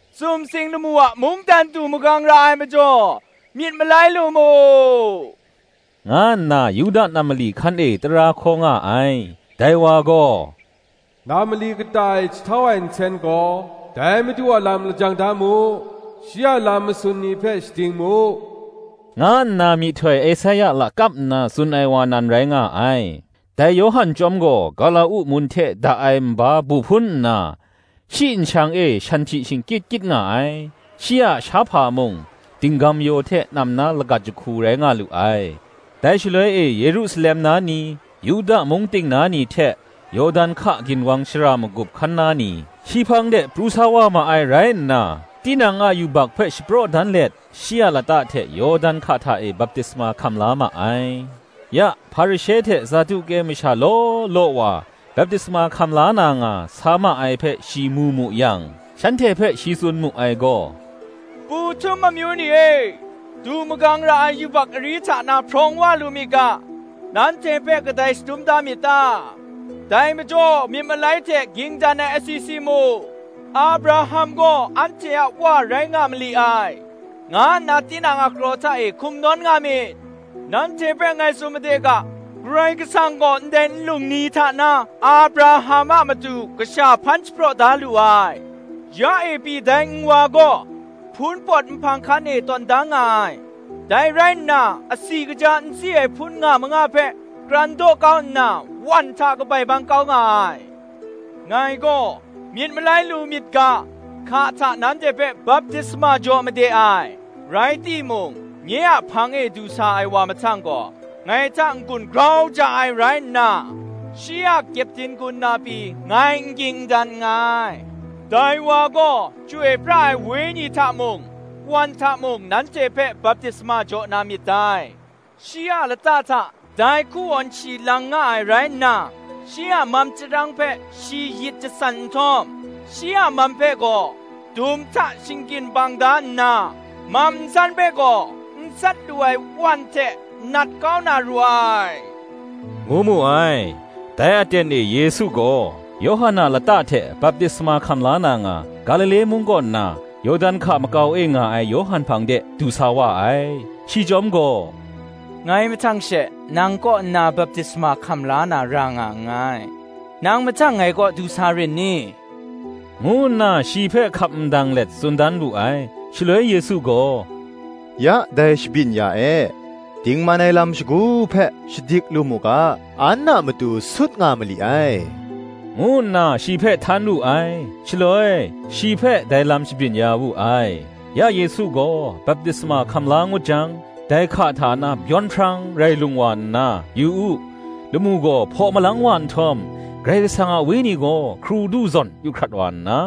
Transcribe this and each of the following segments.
“Sumsing lamu a mungdan du magang ra ai majaw, myit malai lu mu,” nga nna Yuda nam mali hkan e tara hkaw nga ai. Dai wa gaw, “Nam mali kata e jahtau ai nsen gaw, Dai madu a lam lajang da mu, Shi a lam masun ni hpe shading mu!” nga nna myihtoi Esaia lakap nna tsun ai wa nan rai nga ai. Dai Yawhan chyawm gaw, gawla-uk mun hte da ai nba bu hpun nna, shi nshang e shanhpyi shingkyit kyit nga ai: shi a shahpa mung, dinggam-yaw hte nam na lagat jahku rai nga lu ai. Dai shaloi e Yerusalem na ni, Yuda mung ting na ni hte, Yawdan hka ginwang shara magup hkan na ni, shi hpang de pru sa wa ma ai rai nna, tinang a yubak hpe shapraw dan let shi a lata hte Yawdan hka hta e baptisma hkam la ma ai. Ya Hparishe hte Saduke masha law law wa baptisma hkam la na nga sa ma ai hpe shi mu mu yang, shanhte hpe shi tsun mu ai gaw, “Pu htum amyu ni e, du magang ra ai yubak ari hta na hprawng wa lu myit ga, nanhte hpe kadai shadum da myit ta? Dai majaw myit malai hte ging dan ai asi si mu! ‘Abraham gaw anhte a wa rai nga mali ai,’ nga nna tinang a kraw hta e hkum nawn nga myit! nanhte hpe ngai tsun made ga, Karai Kasang gaw ndai nlung ni hta na Abraham a matu kasha hpan shapraw da lu ai. Ya e pyi dai nwa gaw, hpun pawt nhpang hkan e tawn da nga ai; dai rai nna, asi kaja nsi ai hpun nga manga hpe, kran daw kau nna wan hta kabai bang kau nga ai. Ngai gaw, myit malai lu myit ga, hka hta nanhte hpe baptisma jaw made ai, rai timung, nye a hpang e du sa ai wa mahtang gaw, ngai hta n-gun grau ja ai rai nna, shi a kyepdin gun na pyi ngai n ging n dan nngai: dai wa gaw Chyoi pra ai Wenyi hta mung, wan hta mung nanhte hpe baptisma jaw na myit dai: shi a lata hta dai hkuwawn shi lang nga ai rai nna, shi a mam chyarang hpe shi yit jasan nhtawm, shi a mam hpe gaw dum hta shinggyin bang da nna, mam nsan hpe gaw, n sat lu ai wan hte nat kau na ru ai,” ngu mu ai. Dai aten e Yesu gaw, Yawhan a lata hte baptisma hkam la na nga, Galile mung kaw nna, Yawdan hka makau e nga ai Yawhan hpang de, du sa wa ai. Shi chyawm gaw, “Ngai mahtang she nang kaw nna baptisma hkam la na ra nga nngai, nang mahtang ngai kaw du sa rin ni?” ngu nna shi hpe hkap ndang let tsun dan wu ai. Shaloi Yesu gaw, “Ya dai shabyin ya e; dingman ai lam shagu hpe shadik lu mu ga, an a matu sut nga mali ai,” ngu nna shi hpe htan wu ai: shaloi, shi hpe dai lam shabyin ya wu ai. Ya Yesu gaw baptisma hkam la ngut jang, dai hka hta na byawn hprang rai lung wa nna, yu u, lamu gaw hpaw malang wa nhtawm, Karai Kasang a Wenyi gaw, hkrudu zawn yu hkrat wa nna,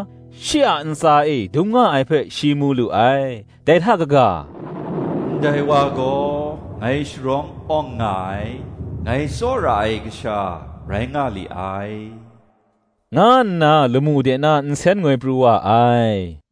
shi a ntsa e dung nga ai hpe shi mu lu ai: dai hta n-ga, “Ndai wa gaw ngai sharawng awng nga ai, ngai tsawra ai Kasha rai nga li ai,” nga nna lamu de na nsen ngoi pru wa ai.